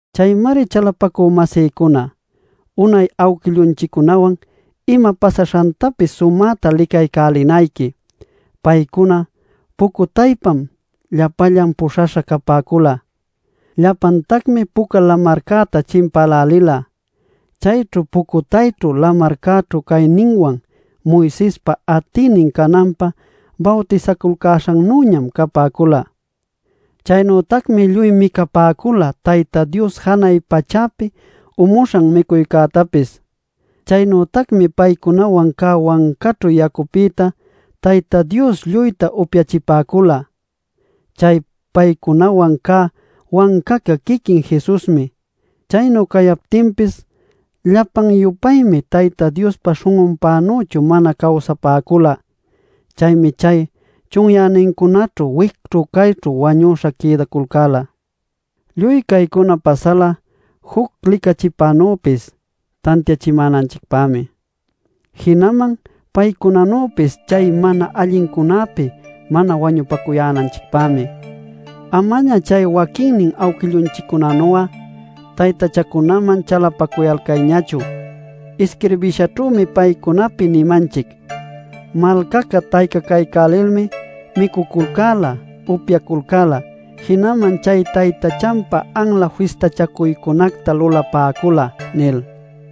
Chaymari chalapacü-masïcuna, unay awquillunchiccunawan ima pasaśhantapis sumäta licaycälinayqui. Paycuna pucutaypam llapallan puśhaśha capäcula. Llapantacmi Puca Lamarcäta chimpälälila. Chaynu pucutayćhu lamarcäćhu cayninwan Moisespa atïnin cananpä bawtisaculcäśhannüñam capäcula. Chaynütacmi lluy micapäcula Tayta Dios janay pachäpi umuśhan micuycätapis. Chaynütacmi paycunawan cä wancaćhu yacupïta Tayta Dios lluyta upyachipäcula. Chay paycunawan cä wancaca quiquin Jesusmi. Chaynu cayaptinpis llapan-yupaymi Tayta Diospa śhun'unpänüchu mana cawsapäcula. Chaymi chay chunyänincunaćhu wicćhu cayćhu wañüśha quïdaculcäla. Lluy caycuna pasala juc licachipänüpis tantiachimänanchicpämi, jinaman paycunanüpis chay mana allincunäpi mana wañupacuyänanchicpämi. Amaña chay waquinnin awquillunchiccunanu'a taytachacunaman chalapacuyalcayñachu. Isquirbishaćhümi paycunapi nimanchic: “Malcaca taycacaycälilmi micuculcäla, upyaculcäla, jinaman chay taytachanpä anla fistachacuycunacta lulapäcula” nil.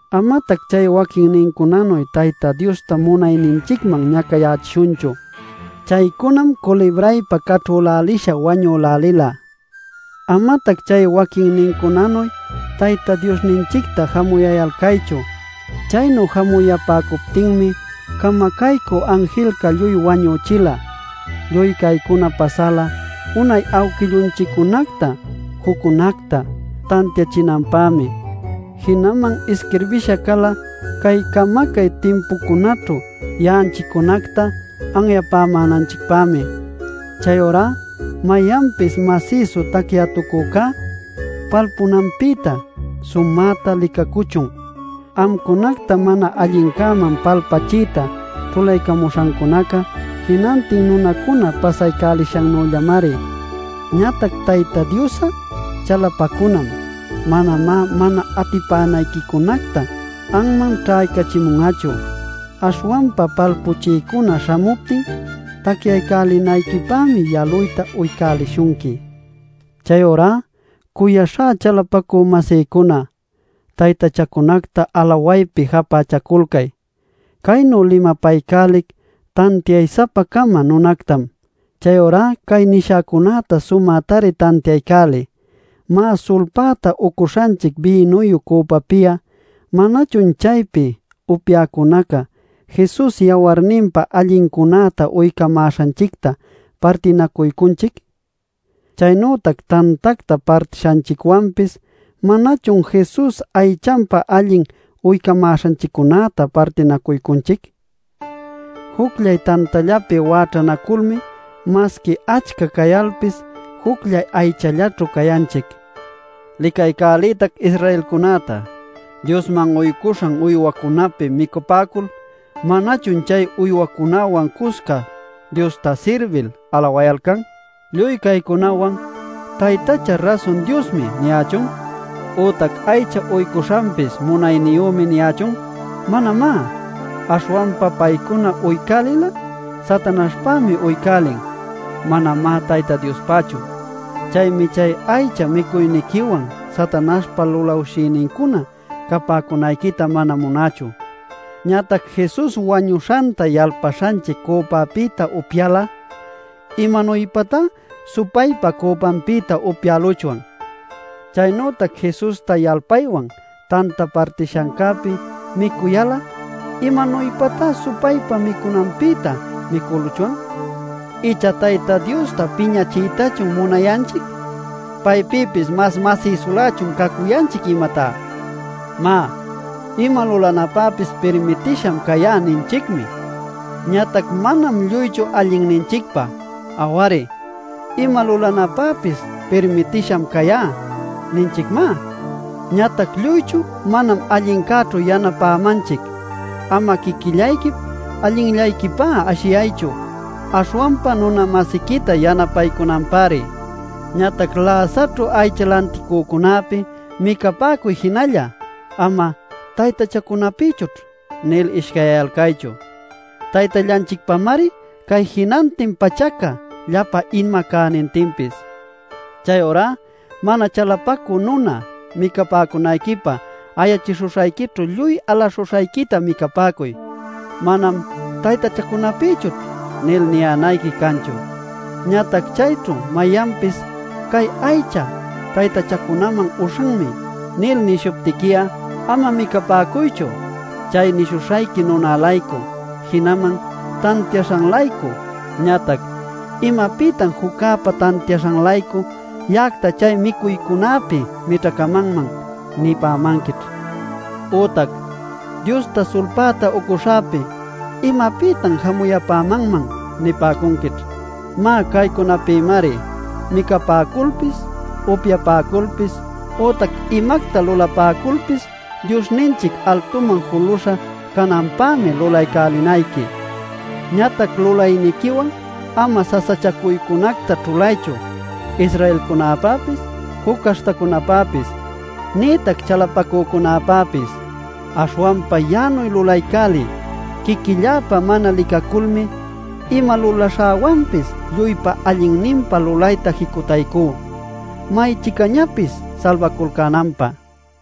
Amatac chay waquinnincunanuy Tayta Diosta munayninchicman ñacayächishunchu. Chaycunam culibraypa caćhülälisha wañülälila. Amatac chay waquinnincunanuy Tayta Diosninchicta jamuyayalcaychu. Chaynu jamuyapäcuptinmi camacaycü anjilca lluy wañüchila. Lluy caycuna pasala unay awquillunchiccunacta juccunacta tantiachinanpämi, jinaman isquirbisha cala cay camacay timpucunäćhu ya'anchiccunacta anyapämänanchicpämi. Chayurá mayanpis masïsu tacyätucücá, palpunanpïta sumäta licacuchun. Amcunacta mana allincäman palpachiyta ćhulaycamuśhancunaca jinantin nunacuna pasaycälishannüllamari. Ñatac Tayta Dios'a chalapacunam; manamá mana atipänayquicunactá anman ćhaycachimun'achu. Aśhwanpa palpuchiycuna śhamuptin, tacyaycälinayquipämi yaluyta uycälishunqui. Chayurá cuyaśhá chalapacü-masïcuna, taytachacunacta alawaypi japächaculcay. Caynu limapaycälic tantiay-sapa-cama nunactam. Chayurá cay nishäcunäta sumätari tantiaycäliy. Má, sulpäta ucuśhanchic bïnuyu cüpapi'a: ¿manachun chaypi upyäcunaca Jesus yawarninpa allincunäta uycamäśhanchicta partinacuycunchic? Chaynütac tantacta partishanchicwanpis ¿manachun Jesus aychanpa allin uycamäśhanchiccunäta partinacuycunchic? Jucllay tantallapi wäćhanaculmi masqui achca cayalpis jucllay aychallaćhu cayanchic. Licaycäliytac Israelcunäta. Diosman uycuśhan uywacunäpi micapäcul ¿manachun chay uycücunäwan cusca Diosta sirbil alawayalcan? Lluy caycunawan ¿“Taytacha rasun diosmi” niyächun ütac “Aycha uycuśhanpis munayniyümi” niyächun? ¡Manamá! Aśhwanpa paycuna uycälil'a Satanaśhpämi uycälin. Manamá Tayta Diospächu. Chaymi chay aycha micuyniquiwan Satanaśhpa lulawshïnincuna capäcunayquita mana munächu. Ñatac Jesus wañuśhanta yalpaśhanchic cüpapïta upyayal'a, ¿imanuypatá supaypa cüpanpïta upyäluchwan? Chaynütac Jesusta yalpaywan tanta partishancäpi micuyal'a ¿imanuypatá supaypa micunanpïta micüluchwan? ¿Icha Tayta Diosta piñachiytachun munayanchic? ¿Paypïpis mas masïsulächun cacuyanchic, imatá? Má, “Ima lulanäpäpis pirmitisham cayá” ninchicmi. Ñatac manam lluychu allinninchicpä. Aw-ari, “Ima lulanäpäpis pirmitisham cayá” ninchicmá. Ñatac lluychu manam allincäćhu yanapämanchic. Ama quiquillayquip allinllayquipá ashiyaychu, aśhwanpa nuna-masiquita yanapaycunanpäri. Ñatac läsaćhu aycha lanticücunäpi micapäcuy jinalla; ama “¿Taytachacunapïchućh?” nil ishcayyayalcaychu. Taytallanchicpamari cay jinantin pachaca, llapa ima cänintinpis. Chayurá mana chalapacü nuna micapäcunayquipä ayachishuśhayquićhu lluy alaśhuśhayquita micapäcuy. Manam “¿Taytachacunapïchućh?” nil niyänayqui canchu. Ñatac chayćhu mayanpis “Cay aycha taytachacunaman uśhanmi” nil nishuptiqui'a, ama micapäcuychu chay nishuśhayqui nuna-laycu, jinaman tantiaśhan-laycu. Ñatac “¿Imapïtan juccäpa tantiaśhan-laycu ya'acta chay micuycunapi mićhacamanman?” nipämanquićh. Ütac “Diosta sulpäta uycuśhäpi ¿imapïtan jamuyapämanman?” nipäcunquićh. Má, caycunapïmari: micapäculpis, upyapäculpis ütac imacta lulapäculpis Diosninchic altuman juluśha cananpämi lulaycälinayqui. Ñatac lulayniquiwan ama sasachacuycunacta ćhulaychu, Israelcunäpäpis, juc caśhtacunäpäpis nïtac chalapacücunäpäpis. Aśhwanpa ya'anuy lulaycäliy: quiquilläpä mana licaculmi, ima lulaśhäwanpis lluypa allinninpä lulayta jicutaycú may-chicañapis salbaculcänanpä.